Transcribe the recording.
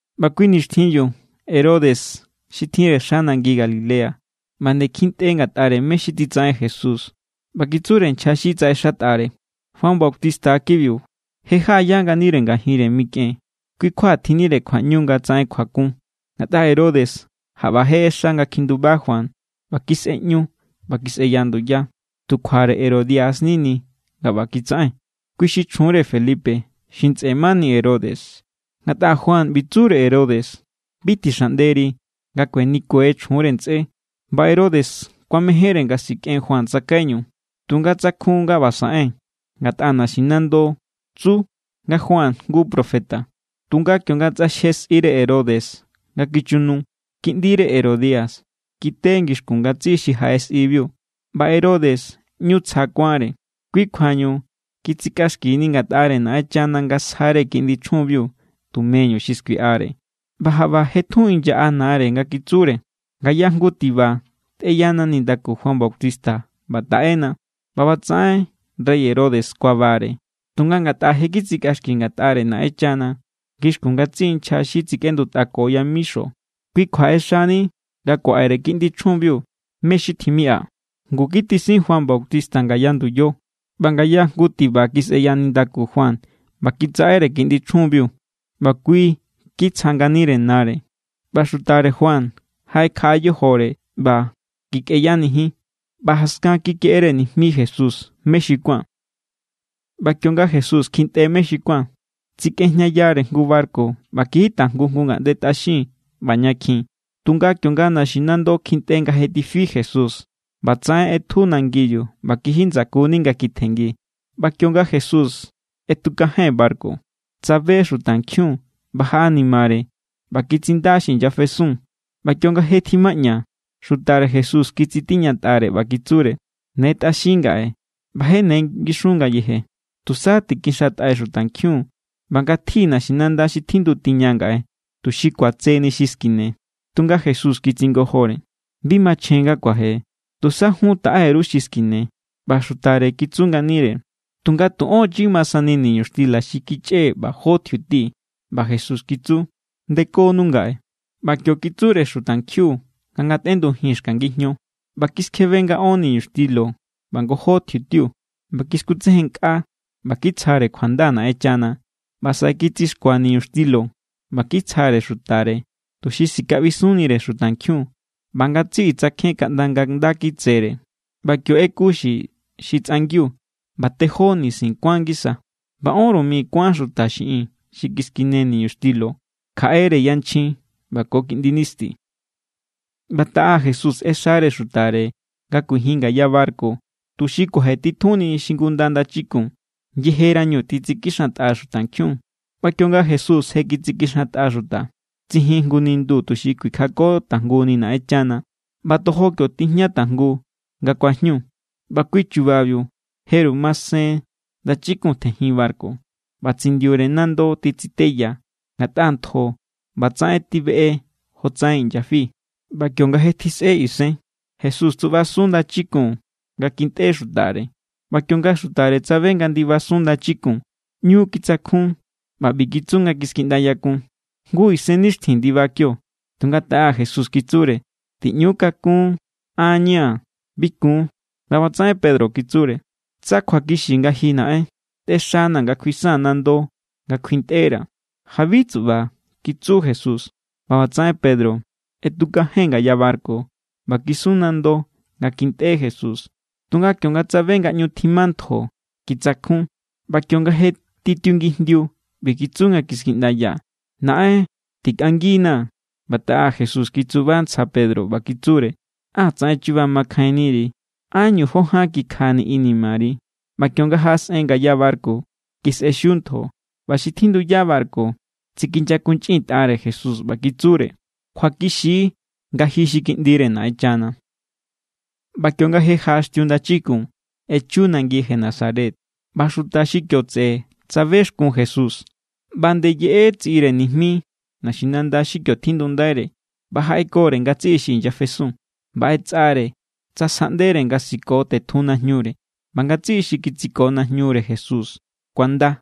ꞌBa kui nixtjinbiu Herodes xi tjinre xa nangi Galilea ꞌba nde kjintꞌe ngatꞌare mé= xi titsaꞌen Jesús. ꞌBa kitsure nchja xi tsaꞌexatꞌare: —Juan Bautista= kibiu. Je jaꞌaya nganire ngajinre mikꞌen, kui= kjua tjinnire kjuaꞌñu nga tsaꞌen kjuakun. Ngatꞌa Herodes jaꞌba je ꞌexa nga kjinduba Juan ꞌba kisꞌeꞌñu ꞌba kisꞌeya nduya. Tu kjuare Herodia= nini nga ꞌba kitsaꞌen. Kui xi chjunre Felipe, xi ntsꞌe mani Herodes. Ngatꞌa Juan ꞌbi tsure Herodes: —Bi tixaꞌnderi nga kuenikue chjunre ntsꞌé. ꞌBa Herodes kuamejénre nga sikꞌen Juan tsakaiñu, tunga tsakjun nga ꞌba saꞌen, ngatꞌa naxinando tsu nga Juan jngu profeta. Tunga kionga tsꞌaxje sꞌire Herodes nga kichu nu, kiꞌndire Herodia kite ngixkun ngatsiꞌi xi jaꞌe sꞌibiu, ꞌba Herodes ꞌñu tsja kuánre. Kui kjuañu kitsikꞌaxkini ngatꞌare Naꞌenchana nga sjare kiꞌndi chjunbiu tumeñu xi skuiꞌare. ꞌBa jaꞌba je tjun inyaꞌa nare nga kitsure: —Ngaya jngu tiba tꞌeyana nindaku Juan Bautista ꞌba taꞌena. ꞌBa ꞌbatsaꞌen rey Herodes kuabare, tunga ngatꞌa je kitsikꞌaxki ngatꞌare Naꞌenchana ngixkun ngatsiꞌi nchja xi tsikꞌendutꞌako yamixo, kui kjua ꞌexani nga kuaꞌere kiꞌndi chjunbiu mé= xi tjimiꞌa. Ngu kitisin Juan Bautista ngaya nduyo. ꞌBa ngaya jngu tiba kisꞌeya nindaku Juan ꞌba kitsaꞌere kiꞌndi chjunbiu, ꞌba kui kitsja nganire nare. ꞌBa xutare Juan jaꞌekjaꞌa yojore ꞌba kikꞌeyanijin, ꞌba jaskan kikeꞌere nijmi Jesús mé xi kuán. ꞌBa kionga Jesús kjintꞌe mé xi kuán, tsikꞌejñayare jngu barku ꞌba kiji tajngu jngu ngaꞌnde tꞌaxin ꞌba ña kjin. Tunga kionga naxinando kjintꞌe nga je tifi Jesús, ꞌbatsaꞌen ꞌetju nangibiu ꞌba kiji ndsakuni nga kitjenngi. ꞌBa kionga Jesús ꞌetukajen barku, tsabe xutankjiun ꞌba jaꞌanimare ꞌba kitsinda xi inyafesun. ꞌBa kionga je tjimaꞌña, xutare Jesús kitsitiñatꞌare ꞌba kitsure: —Ne tꞌaxin ngaꞌe, ꞌba je ne ngixun ngayeje. Tusa tikixantꞌai xutankjiun ꞌba ngatji naxinanda xi tjindu tiña ngaꞌe, tuxi kuatseni xi skine. Tunga Jesús kitsingojore: —Bi machjen nga kuaje. Tusa jun taꞌe_ru xi skine. ꞌBa xutare kitsu nganire: —Tunga tu ón chi ma sani niñuxtila xi kichꞌee̱ ꞌba jó tjiuti. ꞌBa Jesús kitsu: —Ndekonu ngaꞌe. ꞌBa kio kitsure xutankjiun nga ngatꞌendujin xka ngijño, ꞌba kiskjebe nga ón niñuxtilo ꞌba ngojó tjiutiu. ꞌBa kiskutsejennkꞌa ꞌba kitsjare kjuanda Naꞌenchana, ꞌba saꞌe kitsixkua niñuxtilo ꞌba kitsjare xutare, tuxi sikaꞌbisunnire xutankjiun. ꞌBa ngatsiꞌi tsakjen kaꞌnda nga̱ nda kitsere. ꞌBa kio ꞌeku xi xi tsꞌangiu, ꞌba tejó nisin kuán ngisa. ꞌBa ónru mi kuán xuta xiꞌin xi kiskine niñuxtilo, kjaꞌere yanchjin ꞌba ko kiꞌndi nisti. ꞌBa taꞌa Jesús ꞌexare xutare nga kuijin ngaya barku tuxi kuajetitjunni xingunda ndachikun, yejerañu titsikixantꞌa xutankjiun. ꞌBa kionga Jesús je kitsikixantꞌa xuta, tsijin jngu nindu tuxi kuikjako tajnguni Naꞌenchana. ꞌBa tojo kio tijña tajngu nga kuajñu. ꞌBa kui chubabiu, jeru masen ndachikun tjejin barku. ꞌBa tsindiure nando titsiteya, ngatꞌa ntjo ꞌbatsaꞌen tibeꞌe jotsaꞌen inyafi. ꞌBa kionga je tjisꞌe isen, Jesús tsuꞌbasun ndachikun nga kintꞌe xutare. ꞌBa kionga xutare tsabe nga ndibasun ndachikun, ꞌñu kitsakjun, ꞌba ꞌbi kitsu nga kiskiꞌndayakun: —¡Jngu isennixtjin ndiba kio! Tunga taꞌa Jesús kitsure: —¡Tiꞌñu kakún! ¡An= ña̱! ¡Bi kun! ꞌBa ꞌbatsaꞌen Pedro kitsure: —Tsa kjuakixi nga ji, Naꞌen, tꞌexanaa̱ nga kjuisaa̱n nando nga kjuintꞌera̱. —Jabi, tsuꞌba —kitsu Jesús. ꞌBa ꞌbatsaꞌen Pedro ꞌetukajen ngaya barku ꞌba kisun nando nga kintꞌe Jesús. Tunga kionga tsabe nga ꞌñu tjima ntjo, kitsakjun. ꞌBa kionga je titiungijndiu, ꞌbi kitsu nga kiskiꞌndaya: —¡Naꞌen, tikꞌanginaa̱! ꞌBa taꞌa Jesús kitsuba ntsja Pedro, ꞌba kitsure: —¡Á tsaꞌen chuba makjainniri! ¿Ánñu jó ján kikjani inimari? ꞌBa kionga jaꞌasꞌen ngaya barku, kisꞌexiu ntjo. ꞌBa xi tjinduya barku tsikinyakunchꞌintꞌare Jesús ꞌba kitsure: —Kjuakixi= nga ji xi Kiꞌndire Naꞌenchana. ꞌBa kionga je jaꞌaxtiu ndachikun, echu nangi Genesaret. ꞌBa xuta xi kio tseꞌe tsabexkun Jesús, ꞌba nde yeꞌe tsiꞌire nijmi naxinanda xi kio tjindundaire ꞌba jaꞌekore ngatsiꞌi xi inyafesun. ꞌBa ꞌetsꞌare tsa sjaꞌndere nga siko tetjun najñure. ꞌBa ngatsiꞌi xi kitsiko najñure Jesús kuanda.